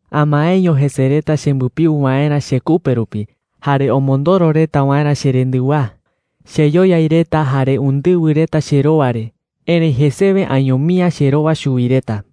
6Amaeño jese reta chembɨpiu waerä chekupe rupi jare omondoro reta waerä cherendɨwaa. Cheyoyai reta jare undɨwɨ reta cherowa re, erëi jesewe añomi’ä cherowa chuwi reta.